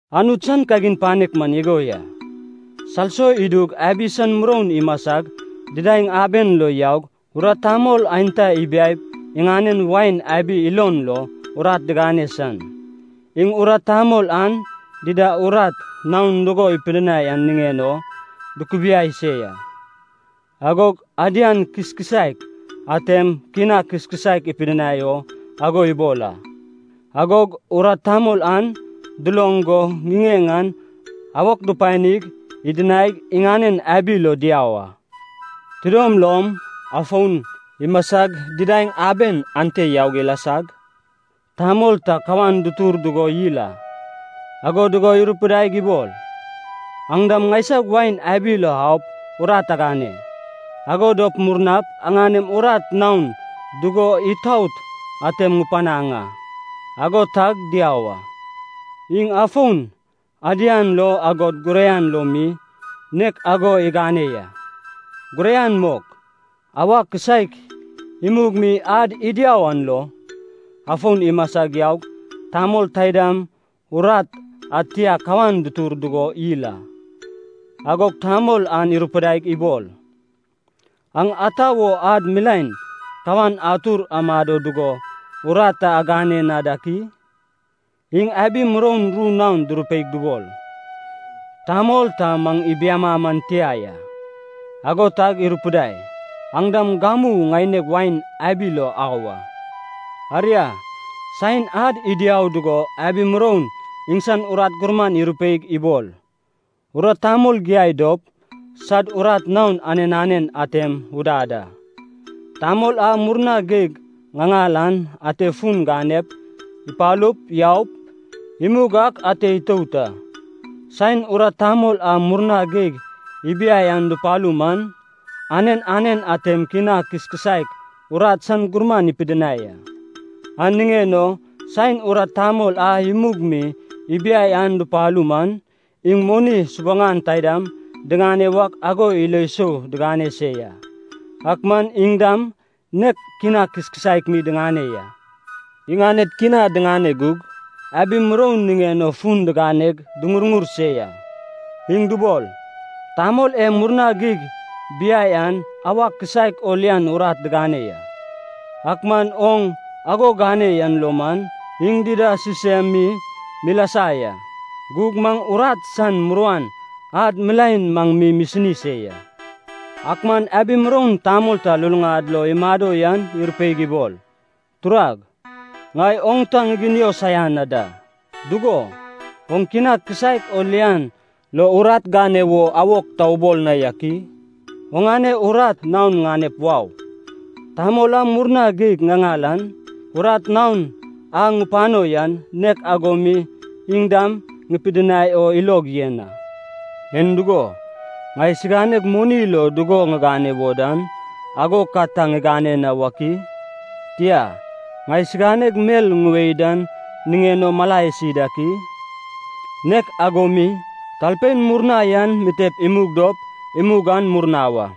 “Anut san kagin panek man igo ya. Salso idug abi san muroun imasag didaeŋ aben lo yaug urat tamol aenta ibiaip iŋanen wain abi ilon lo urat digane san. Iŋ urat tamol an dida urat naon dugo ipidinai an niŋen o dukubiai se ya. Agog adian kiskisaek atem kina kiskisaek ipidinai o ago ibol a. Agog urat tamol an duloŋ go ŋiŋeŋ an awok dupanig idinaig iŋanen abi lo diau a. “Tidom lom, afon imasag didaeŋ aben ante yaug ilasag, tamol ta kawan dutur dugo yil a. Ago dugo irupidaig ibol, ‘Aŋ dam ŋaisag wain abi lo aup urat agane. Ago dop murnap aŋanem urat naon dugo itaot atem ŋupanaŋ a.’ Ago tag diau a. Iŋ afon, adian lo agod guraian lo mi, nek ago igane ya. Guraian mok, auwa kisaek imug mi ad idiau an lo, afon imasag yaug tamol taidam urat ad tia kawan dutur dugo yil a. Agog tamol an irupidaig ibol, ‘Aŋ ata wo ad milaen kawan atur amado dugo urat ta agane na dak i?’ Iŋ abi muroun ru naon durupeig dubol, ‘Tamol ta maŋ ibiama man tia ya.’ Ago tag irupidai, ‘Aŋ dam gamu ŋaineg wain abi lo au a.’ “Aria, saen ad idiau dugo abi muroun iŋsan urat gurman irupeig ibol, ‘Urat tamol giai dop sad urat naon anen anen atem udad a. Tamol a murna geig ŋaŋal an ate fun ganep, ipalup, yaup, imug ak ate itout a.’ Saen urat tamol a murna geig ibiai an dupalu man, anen anen atem kina kiskisaek urat san gurman ipidinai a. An niŋen o saen urat tamol a imug mi ibiai an dupalu man, iŋ moni subuŋan taidam diŋane wak ago ilo sou digane se ya, ak man iŋ dam nek kina kiskisaek mi diŋane ya. Iŋaned kina diŋane gug, abi muroun niŋen o fun diganeg duŋurŋur se ya. Iŋ dubol, ‘Tamol e murna geig biai an auwa kisaek o lian urat digane ya, ak man oŋ ago gane yan lo maŋ iŋ dida sisem mi milasa ya. Gug maŋ urat san muruan ad milaen maŋ mi misini se ya.’ “Ak man abi muroun tamol ta luluŋad lo imado yan irupeig ibol, ‘Turag, ŋai oŋ ta ŋiginio saian na da. Dugo, oŋ kina kisaek o lian lo urat gane wo awok ta ubol na yak i? Oŋane urat naon ŋanep wau. Tamol a murna geig ŋaŋal an, urat naon a ŋupano yan, nek ago mi iŋ dam ŋupidinai o ilog yen a. En dugo, ŋai siganeg moni lo dugo ŋigane wo dan, ago ka ta ŋigane na wak i? Tia, ŋai siganeg mel ŋuwae dan niŋen o mala isi dak i?’ “Nek ago mi, talpein murna yan mitep imug dop, imug an murna wa.”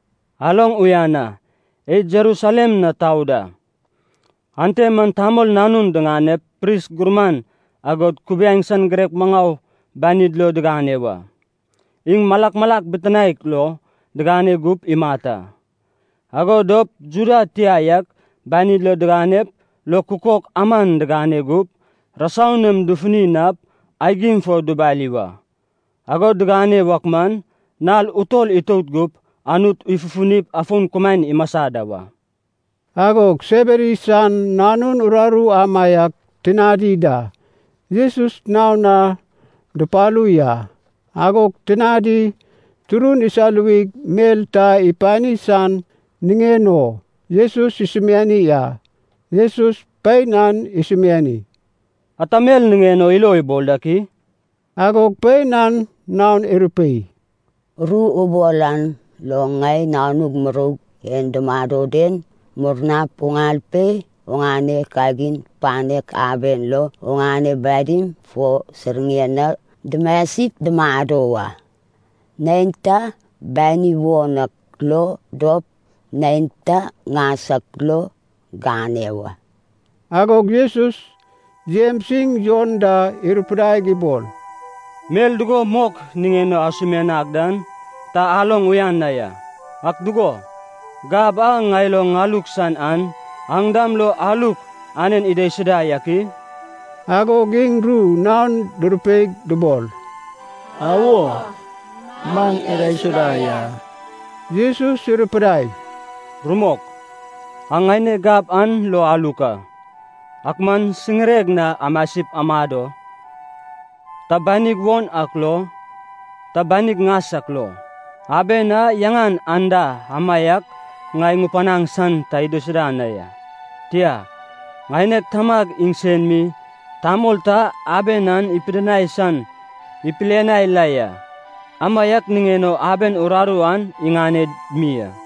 “Aloŋ uyan a, id Jerusalem na tau da. Ante man Tamol Nanun diŋanep pris gurman agod kubiaeŋ san girek maŋau banid lo digane wa. Iŋ malak malak bitinaek lo digane gup imat a. Ago dop Juda tia yak banid lo diganep lo kukok aman digane gup, rasau nam dufuni nap, aigim fo dubali wa. Ago digane wak man, nal utol itout gup, Anut ifufunip afon kumaen imasa da wa.” Agog Sebedi san nanun uraru amaiak tinadi da, Jesus naon na dupalu ya. Agog tinadi turun isaluwig mel ta ipani san niŋen o Jesus isumiani a. Jesus pein an isumiani, “Ata mel niŋen o ilo ibol dak i?” Agog pein an naon irupei, “Ru ubol an lo ŋai nanug muroug e dumado den, murnap uŋal pe oŋane kagin panek aben lo, oŋane badim fo siŋire na dumasip dumado wa. Neinta bani won ak lo dop, neinta ŋas ak lo gane wa.” Agog Jesus, Jems iŋ Jon da irupidaig ibol, “Mel dugo mok niŋen o asumianag dan ta aloŋ uyan na ya. Ak dugo, gab a ŋai lo ŋaluk san an, aŋ dam lo aluk anen idaisuda yak i?” Agog iŋ ru naon durupeig dubol, “Awo, maŋ idaisuda ya.” Jesus irupidai, “Rumok, aŋ ŋaineg gab an lo aluk a. Ak man siŋireg na amasip amado, ta banig won ak lo, ta banig ŋas ak lo, aben a yaŋan anda amaiak ŋai ŋupanaŋ san ta idaisuda na ya. Tia, ŋaineg Tamag iŋsen mi tamol ta aben an ipidinai san ipilianai la ya, amaiak niŋen o aben uraru an iŋaned mi a.”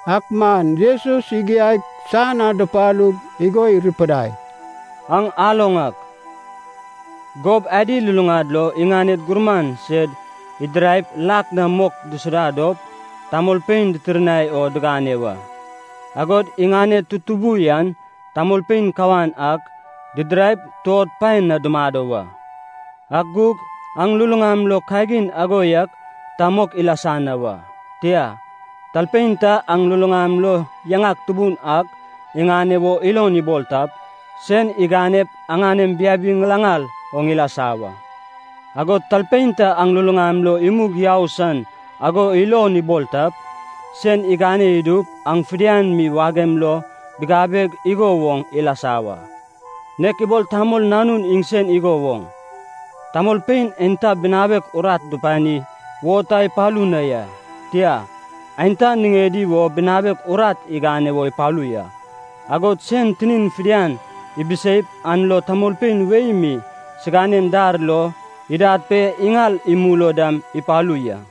Ak man Jesus igiaig san na dupalug igo irupidai, “Aŋ aloŋ ak, gob adi luluŋad lo iŋaned gurman sed idiraip lak na mok disuda dop tamolpein ditirnai o digane wa. Agod iŋaned tutubu yan tamolpein kawan ak didiraip tuod paed na dumado wa. Ak gug aŋ luluŋam lo kagin ago yak ta mok ilasa na wa. Tia, talpein ta aŋ luluŋam lo yaŋak tubun ak iŋane wo ilon ibol tap, sen iganep aŋanem biabi ŋilaŋal oŋ ilasa wa. Agod talpein ta aŋ luluŋam lo imug yau san ago ilon ibol tap, sen igane idup aŋ fidian mi wagem lo bigabeg igo woŋ ilasa wa. Nek ibol Tamol Nanun iŋsen igo woŋ, tamolpein aenta binawek urat dupani wo ta ipalu na ya, tia, aenta niŋedi wo binawek urat igane wo ipalu ya. Agod sen tinin fidian ibiseip an lo tamolpein wei mi siganen dar lo idad pe iŋal imul o dam ipalu ya.”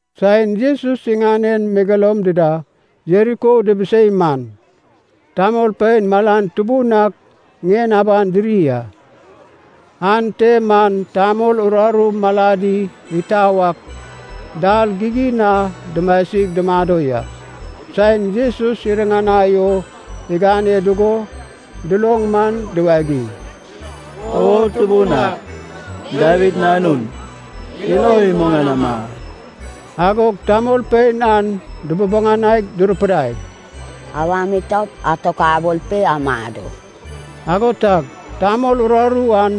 Saen Jesus iŋanen megeloum dida Jeriko dibisei man, tamolpein malan tubun ak ŋien aban diri a. Ante man tamol uraru maladi itau ak dal gigin na dumasig dumado ya. Saen Jesus iriŋanai o igane dugo duloŋ man diwagiŋ, “O Tubun ak, Dawid Nanun, ilo imuŋanama!” Agog tamolpein an dububuŋanaig durupidai, “Awam itaup atokabol pe amado!” Ago tag tamol uraru an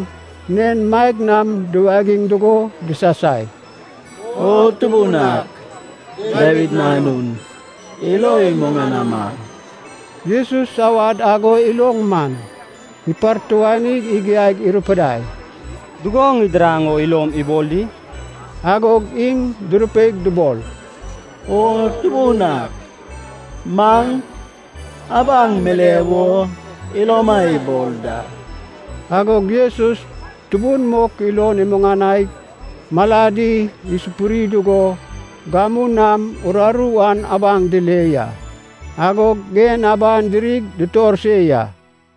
nen maeg nam duwagiŋ dugo disasai, “O Tubun ak, Dawid Nanun, ilo imuŋanama!” Jesus awad ago iloŋ man, ipartuanig igiaig irupidai, “Dugo ŋidiraŋ o ilom ibol di?” Agog iŋ durupeig dubol, “O Tubun ak, maŋ abaŋ mile wo iloma ibol da.” Agog Jesus tubun mok ilon imuŋanaig maladi isupuri dugo gamu nam uraru an abaŋ dile ya. Agog ŋien aban dirig dutor se ya.